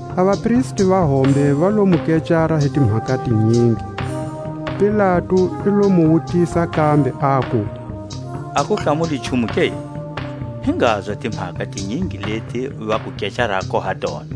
A vapristi va hombe va lo mu kecara hi timhaka tinyingi. Pilatu i lo mu wutisa kambe, aku: A ku hlamuli nchumu ke? Hi ngazwa a timhaka tinyingi leti va ku kecarako ha tona!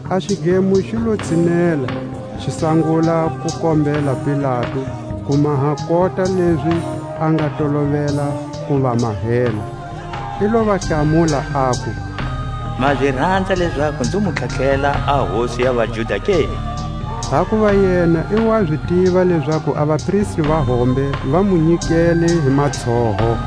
A xidlemo xi lo tshinela, xi sangula ku kombela Pilatu ku maha kota lezi a nga tolovela ku va mahela. I lo va hlamula, aku: Ma zi ranza lezaku nzi mu tlharihela a Hosi ya vaJuda ke? Hakuva yena i wa zi tiva lezaku a vapristi va hombe va mu nyikele hi matshoho.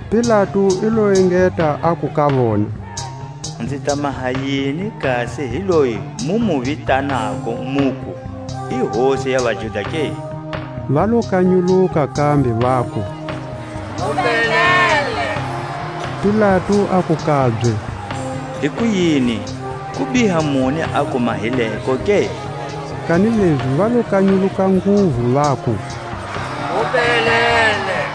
Pilatu i lo engeta aku ka vona: Nzi ta maha yini kasi hi loyi mu mu vitanako muku i hosi ya vaJuda ke? Va lo kanyuluka kambe, vaku: Mu belele. Pilatu aku kabye: Hikuyini, kubiha muni a ku mahileko ke? Kanilezi va lo kanyuluka nguvu, vaku: Mu belele.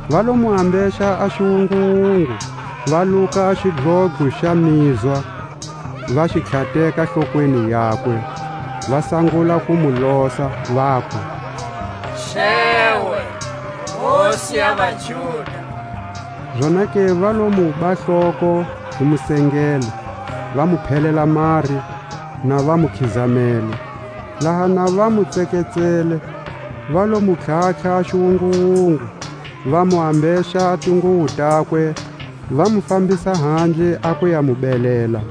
Va lo mu ambexa a xiwunguwungu, va luka a xidlodlo xa mizwa, va xi tlhateka hlokweni yakwe; va sangula ku mu losa, vaku: Xewe, Hosi ya vaJuda. Zonake va lo muba hloko hi musengele, va mu phelela mari, na va mu khizamele. Laha na va mu tseketsele, va lo mu tlhatlha a xiwunguwungu, va mu ambexa a tinguwo takwe, va mu fambisa handle a ku ya mu belela.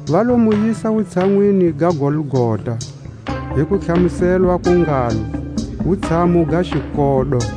Va lo mu yisa wutshanwini ga Golgota, hi kutlhamuselwa ku ngalo: Wutshamu ga xikodo;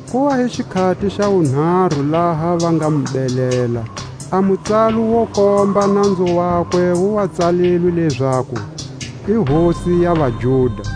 Ku wa hi xikhati xa wunharu laha va nga mu belela. A mutsalo wo komba nanzu wakwe wu wa tsalilwe lezaku, l Hosi ya vaJuda.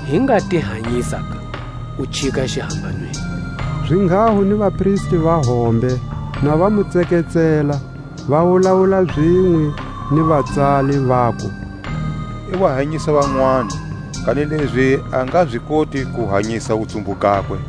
hi nga ti hanyisa ka, u chika xihambanweni. Zinghaho ni vapristi va hombe na va mu tseketsela, va wulawula zinwe ni vatsali, vaku: I wa hanyisa vanwani, kanilezi a nga zi koti ku hanyisa wutsumbu gakwe.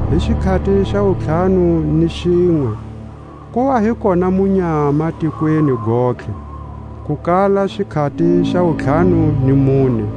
Hi xikhati xa wuntlhanu ni xinwe ku wa hi kona munyama tikweni gontlhe, ku kala xikhati xa wuntlhanu ni mune.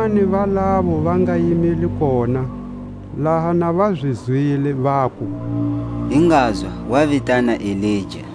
Vanwani va lavo va nga yimile koha, laha na va zi zwile, vaku. Hi ngazwa, wa vitana Elija.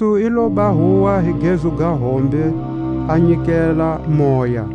Jesu i loba huwa hi gezu ga hombe, a nyikela moya.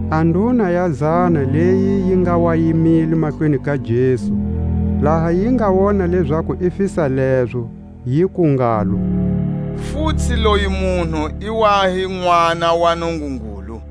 A nduna ya zana leyi yi nga wa yimile mahlweni ka Jesu, laha yi nga wona lezaku i fisa lezo, yiku ngalo: Futsi loyi munhu i wa hi Nʼwana wa Nungungulu.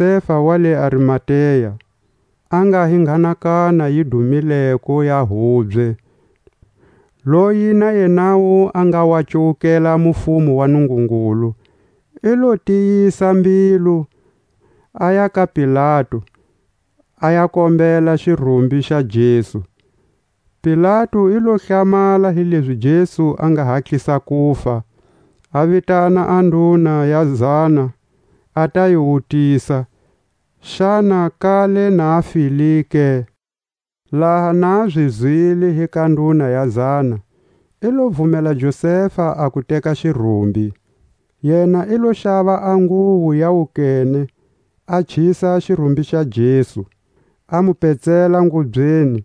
ku lota Josefa wa le Arimatea, a nga hi nghanakana yi dumileko ya hubye, loyi na yenawu a nga wa cuwukela a mufumo wa Nungungulu; i lo tiyisa mbilu, aya ka Pilatu, a ya kombela xirumbi xa Jesu. Pilatu i lo hlamala hilezi Jesu a nga hatlisa kufa, a vitana a nduna ya zana a ta yi wutisa, xana kale na a file ke. Laha na zi zwile hi ka nduna ya zana, i lo vumela Josefa a ku teka xirumbi. Yena i lo xava a nguwo ya wukene, a chisa xirumbi xa Jesu, a mu petsela ngubyeni,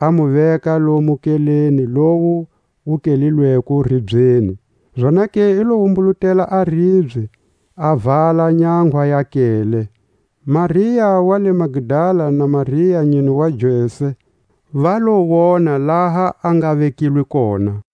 a mu veka lomu nkeleni lowu wu kehlelweko ribyeni; zonake i lo wumbulutela a ribye, a vala nyanga ya nkele. Maria wa le Magdala, na Maria a nyine wa Jose, va lo wona laha a nga vekilwe kona.